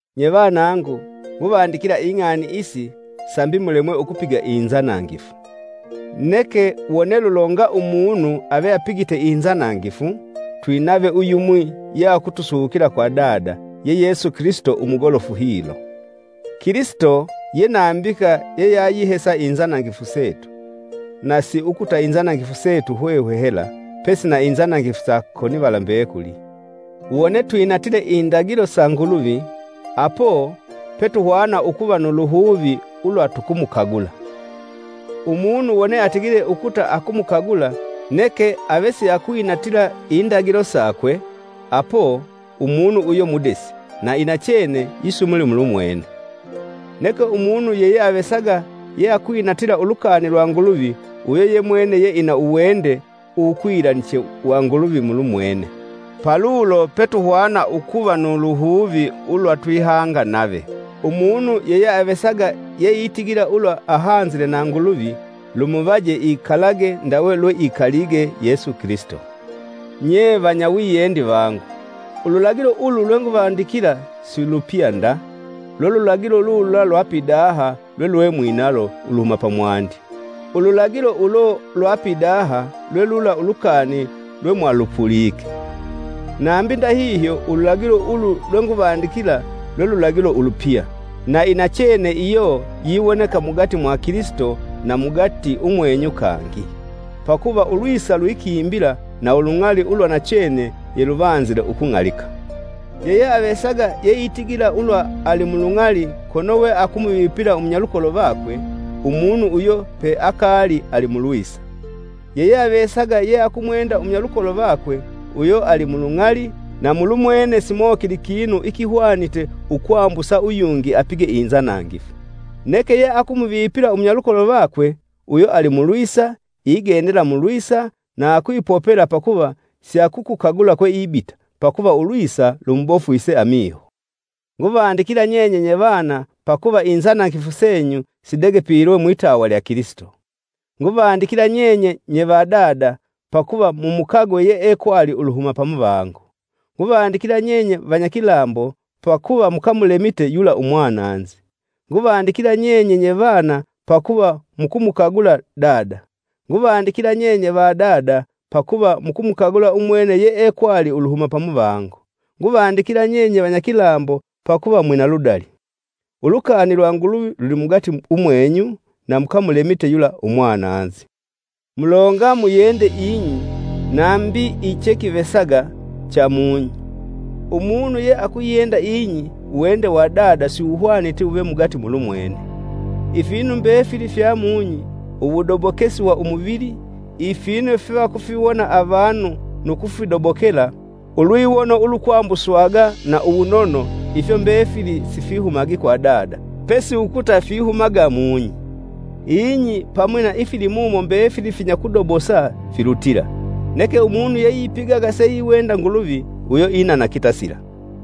Nye vanangu, nguvandikila ing'ani isi, sambi mulemwe ukupiga inzanangifu. Neke wone lulonga umunu ave apigite inzanangifu, twinave uyumwi ye akutusukila kwa Dada, ye Yesu Kilisito umugolofu hilo. Kilisito ye nambika yeyayihesa inzanangifu setu; na siukuta inzanangifu setu hwehwe hela, pesi na inzanangifu sa konivala mbekuli. Wone twinatile indagilo sa Nguluvi, apo, pe tuhwana ukuva nu luhuvi ulwa tukumukagula. Umunu wone atigile ukuta akumukagula, neke ave siakwinatila indagilo sakwe, apo, umunu uyo mudesi, na inachene yisumuli mulumwene. Neke umunu yeyeavesaga yeakwinatila ulukani lwa Nguluvi uyo yemwene yeina uwende uwukwilaniche wa Nguluvi mulumwene. Palulo petuhwana ukuva nu luhuvi ulwa twihanga nave. Umunu yeyeavesaga yeitigila ulwa ahanzile na Nguluvi, lumuvaje ikalage ndawe lweikalige Yesu Kilisito. Nye vanyawiyendi vangu, ululagilo ulu lwenguvandikila si lupya nda: lwe lulagilo lulula lwa pidaha lwelwemwinalo uluhuma pamwandi. Ululagilo ulo lwa pidaha lwe lula ulukani lwemwalupulike. Nambi ndahihyo, ululagilo ulu lwenguvandikila lwe lulagilo ulupya, na inachene iyo yiwoneka mugati mwa Kilisito na mugati umwenyu kangi. Pakuva ulwisa lwikimbila na ulung'ali ulwa nachene yeluvanzile ukung'alika. Yeyeavesaga yeitigila ulwa ali mulung'ali, kono weakumuvipila umunyalukolo vakwe, umunu uyo peakaali alimulwisa. Yeyeavesaga yeakumwenda umunyalukolo vakwe, uyo ali mulung'ali na mulumwene simokili kinu ikihwanite ukwambusa uyungi apige inzanangifu. Neke yeakumuvipila umunyalukolo vakwe, uyo ali mulwisa; igendela mulwisa, na akwipopela pakuva siakukukagula kweibita, pakuva ulwisa lumubofwise amiho. Nguvandikila nyenye nyevana, pakuva inzanangifu senyu sidegepilwe mwitawa lya Kilisito. Nguvandikila nyenye nye va dada, pakuva mumukagwe yeekwali uluhuma pamuvango. Nguvandikila nyenye vanyakilambo, pakuva mukamulemite yula umwananzi. Nguvandikila nyenye nye vana, pakuva mukumukagula Dada. Nguvandikila nyenye va dada, pakuva mukumukagula umwene yeekwali uluhuma pamuvango. Nguvandikila nyenye vanyakilambo pakuva mwina ludali; ulukani lwa Nguluvi lulimugati umwenyu na mukamulemite yula umwananzi Mulonga muyende ing'i nambi ichekivesaga cha mung'i. Umunu yeakuyenda ing'i, uwende wa Dada siwuhwaniti wuve mugati mulumwene. Ifinu mbefili fya mung'i, uwudobokesi wa umuvili, ifinu fyevakufiwona avanu nu kufidobokela, ulwiwono ulukwambuswaga na uwunono ifyo mbefili sifihumagi kwa Dada, pesi ukuta fihumaga mung'i. Ing'i pamwi na ifilimumo mbefili finyakudobosa filutila; neke umunu yeipigaga seiwenda Nguluvi, uyo inana kitasila.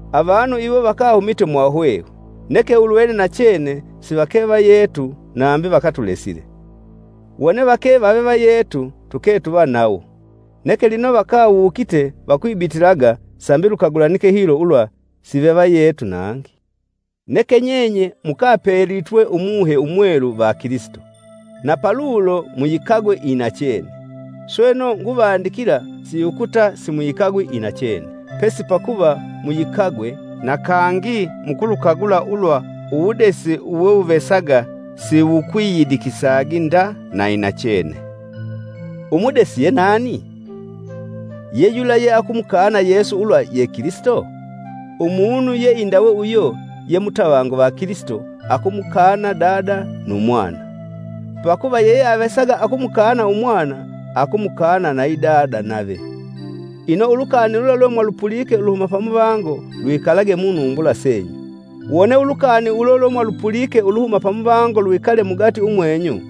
avanu iwo vakahumite mwahwehwe, neke ulwene nachene sivake vayetu nambi vakatulesile, wone vake vave vayetu, tuke tuva nawo. Neke lino vakawukite, vakwibitilaga, sambi lukagulanike hilo ulwa sivevayetu nangi. Neke nyenye mukapelitwe Umuhe Umwelu va Kilisito, na palulo muyikagwe inachene. Sweno, nguvandikila, siukuta simuyikagwi inachene, pesi pakuva muyikagwe, na kangi mukulukagula ulwa uwudesi uwewuvesaga siwukwiyidikisagi nda na inachene. Umudesi yenani? Ye yula yeakumukana Yesu ulwa ye Kilisito? Umunu yeindawe uyo ye mutavangu va Kilisito akumukana Dada nu Mwana. Pakuva yeyeavesaga akumukana Umwana, akumukana nayi Dada nave. Ino, ulukani lula lwemwalupulike uluhuma pamuvango lwikalage munumbula senyu. Wone ulukani ulo lwemwalupulike uluhuma pamuvango lwikale mugati umwenyu,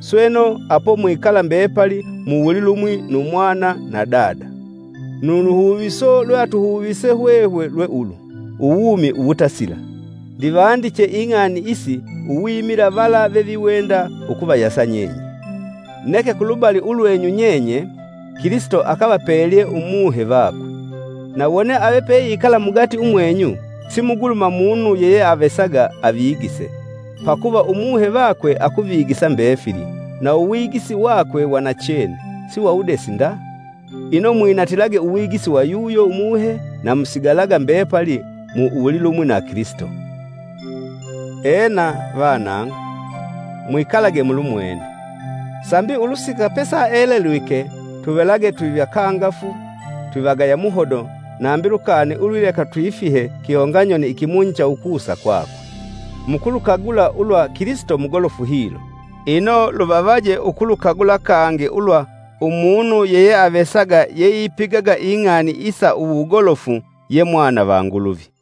sweno, apo mwikala mbepali mu wulilumwi nu Mwana na Dada. Nu luhuviso lweatuhuvise hwehwe lwe ulu: Uwumi uwutasila. Ndivandiche ing'ani isi uwimila vala veviwenda ukuvayasa nyenye. Neke, kulubali ulwenyu nyenye, Kilisito akavapelye Umuhe vakwe. Na wone ave peikala mugati umwenyu, simugulumu munu yeyeavesaga avigise. Pakuva Umuhe vakwe akuvigisa mbefili, na uwigisi vakwe wa nachene, si wa wudesi nda. Ino, mwinatilage uwigisi wa yuyo Umuhe na musigalaga mbepali mu wulilumwi na Kilisito. Ena, vanangu, mwikalage mulumwene, sambi ulusika pesaelelwike tuvelage twivakangafu twivagaya muhodo nambi lukani ulwileka twifihe kihonganyoni ikimunyi cha ukusa kwakwe. Mukulukagula ulwa Kilisito mugolofu hilo ino, luvavaje ukulukagula kangi ulwa umunu yeyeavesaga yeipigaga ing'ani isa uwugolofu ye mwana va Nguluvi.